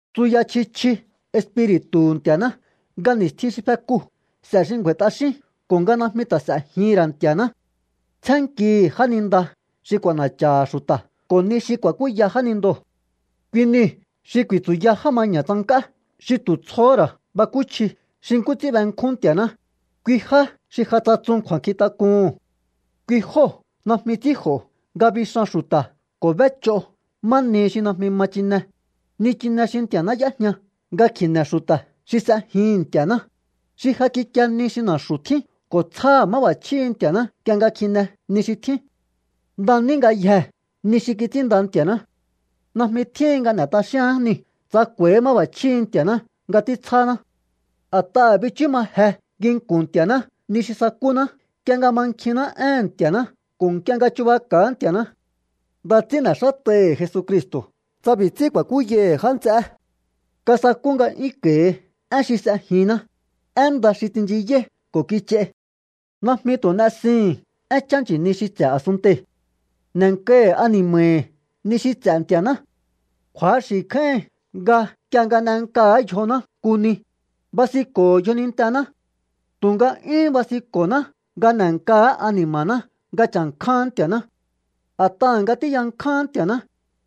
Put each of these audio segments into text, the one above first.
Tsuya chji chji Espiri̱tu̱hu̱ Nti̱a̱ná nga ni̱stjin xi fekuu̱ s'e̱ xi ngju̱a̱i̱ t'axín ko̱ nga najmi ta̱ s'e̱jihi̱n ra̱ Nti̱a̱ná. Tsjénnkihi̱ jáninda xi k'u̱a̱na̱cha̱ha̱ xu̱ta̱ ko̱ ni xi ku̱a̱kúya jánindoo̱. Kui niu̱ xi ku̱i̱tsu̱ya já maña̱ tsank'á xi tu̱ tsjohó ra̱ bakúchji xi nkú ts'ín benkjún Nti̱a̱ná, kui já xi ja tsatsun kju̱a̱nkjintak'uhu̱n. Kui jóo̱ najmi ts'ínj'o̱ nga bixan xu̱ta̱ ko̱ b'éch'o má nihi xi najmi ma chine, nichine xi Nti̱a̱ná y'éjña nga kji̱ne̱ xu̱ta̱ xi s'ejihi̱n Nti̱a̱ná, xi ja kikie ni xi na̱xu̱ tjín ko̱ tsjáha̱ má b'a̱chjíhi̱ Nti̱a̱ná nk'ie nga kjine ni xi tjín. Nda ní ngayjee̱ ni xi kits'ínnda Nti̱a̱ná. Najmi tjíhin nga n'e̱ t'axíaán niu̱ tsa k'u̱a̱íhi̱ máb'a̱chjíhi̱ Nti̱a̱ná nga títsjáná. A̱t'aha̱ bichú ma je nginku̱n Nti̱a̱ná ni xi sakúná nk'ie nga mankjinná éhe̱n Nti̱a̱ná ko̱ nk'ie nga chubaka̱á Nti̱a̱ná. Nda ts'ín n'e̱xát'aihi̱ Jesucristo̱ tsa b'i̱ ts'ín ku̱a̱kúyaihi̱ já nts'eé. Kasakú nga'yúnko̱i̱hi én xi s'ejinná, én nda xi tsinchiyáí ko̱ kich'ai. Najmi tu̱ n'esihi̱n énchá nchi̱ni xi ts'e̱ a̱sunntei̱. N'e̱nkahi̱ ani̱ma̱hi̱ ni xi ts'e̱ Nti̱a̱ná. Kju̱axi̱ kjáíhin nga nk'ie nga n'enkaha̱á yjoná nku ni, basinko̱ho̱ yjonintená. Tu̱nga 'yúhún basinko̱ná nga n'e̱nkaha̱á ani̱ma̱ná nga cha̱nkjáán Nti̱a̱ná. A̱t'aha̱ nga tíyankjáán Nti̱a̱ná,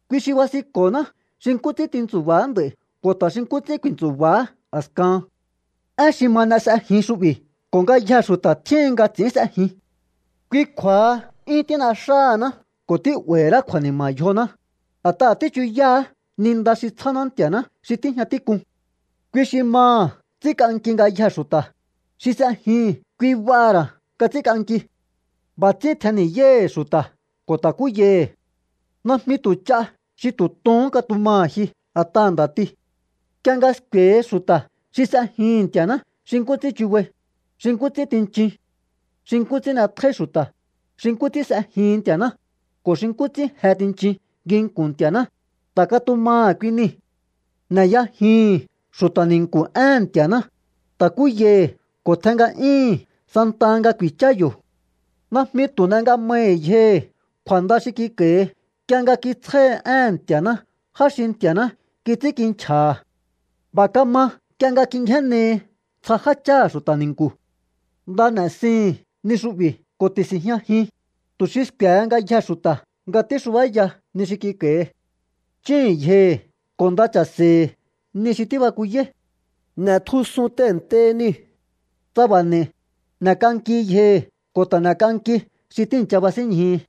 kui xi basinko̱ná xi nkú ts'ín tintsu̱ba̱á nd'a̱i̱ ko̱ ta̱ xi nkú ts'ín ku̱i̱ntsu̱ba̱á a̱skahan. Én xi ma n'e s'ejin xu'bi̱ ko̱ ngayjee̱ xu̱ta̱ tjíhin nga ts'i̱ín s'ejin. Kui kju̱a̱ha 'yún tín'exáhaná ko̱ tí'ba̱i̱hi̱ ra̱á kju̱a̱ni̱ma̱ yjoná, a̱t'aha̱ tíchuyáá ni nda xi tsjáná Nti̱a̱ná xi tíjña tík'un. Kui xi maha̱ ts'ínk'anki ngayjee̱ xu̱ta̱, xi s'ejihi̱n kui b'aha̱ ra̱ nga ts'ínk'anki. B'a̱ ts'ín tjenni̱yáíhi̱ xu̱ta̱ ko̱ ta̱kúyaihi̱. Najmi tu̱ ch'a xi tu̱ tohón katumaha̱ ji a̱t'aha̱ nda̱ti. Nk'ie nga sku̱e̱hi xu̱ta̱ xi s'ejihi̱n Nti̱a̱ná xi nkú ts'ín chubai, xi nkú ts'ín tinchin, xi nkú ts'ín n'etjóí xu̱ta̱, xi nkú ts'ín s'ejihin Nti̱a̱ná, ko̱ xi nkú ts'ín je tinchin nginku̱n Nti̱a̱ná, ta̱ katumaha̱ kui nii̱. N'eyajihi̱n xu̱ta̱ ni̱nku̱ éhe̱n Nti̱a̱ná, ta̱kúyai ko̱ tjen nga'yúíhi̱n santaha nga ku̱i̱chá yo̱. Najmi tu̱ n'e nga mahi̱ yjohi̱ kju̱a̱nda xi kik'a̱i̱hi nk'ie nga kitsjáhi éhe̱n Nti̱a̱ná já xi Nti̱a̱ná kits'ínkinchja̱ha̱. B'a̱ kama nk'ie nga kingjénnehi ntsja jácháha̱ xu̱ta̱ ni̱nku̱. Nda n'e̱sihi̱n ni xu'bi̱ ko̱ ti̱si̱njñajin, tu̱ xi sku̱e̱he ngayjee̱ xu̱ta̱ nga tíxubáya ni xi kik'a̱i̱hi. Chíhi̱n yjohi̱ ko̱ nda cha̱se̱hi̱ ni xi tíbakuyáí. N'e̱tjusun tehe̱ntei niu̱. Tsa b'a̱ n'e̱i̱, n'e̱k'anki yjohi̱ ko̱ ta̱ n'e̱k'anki xi tíi̱ncha basínñjihi.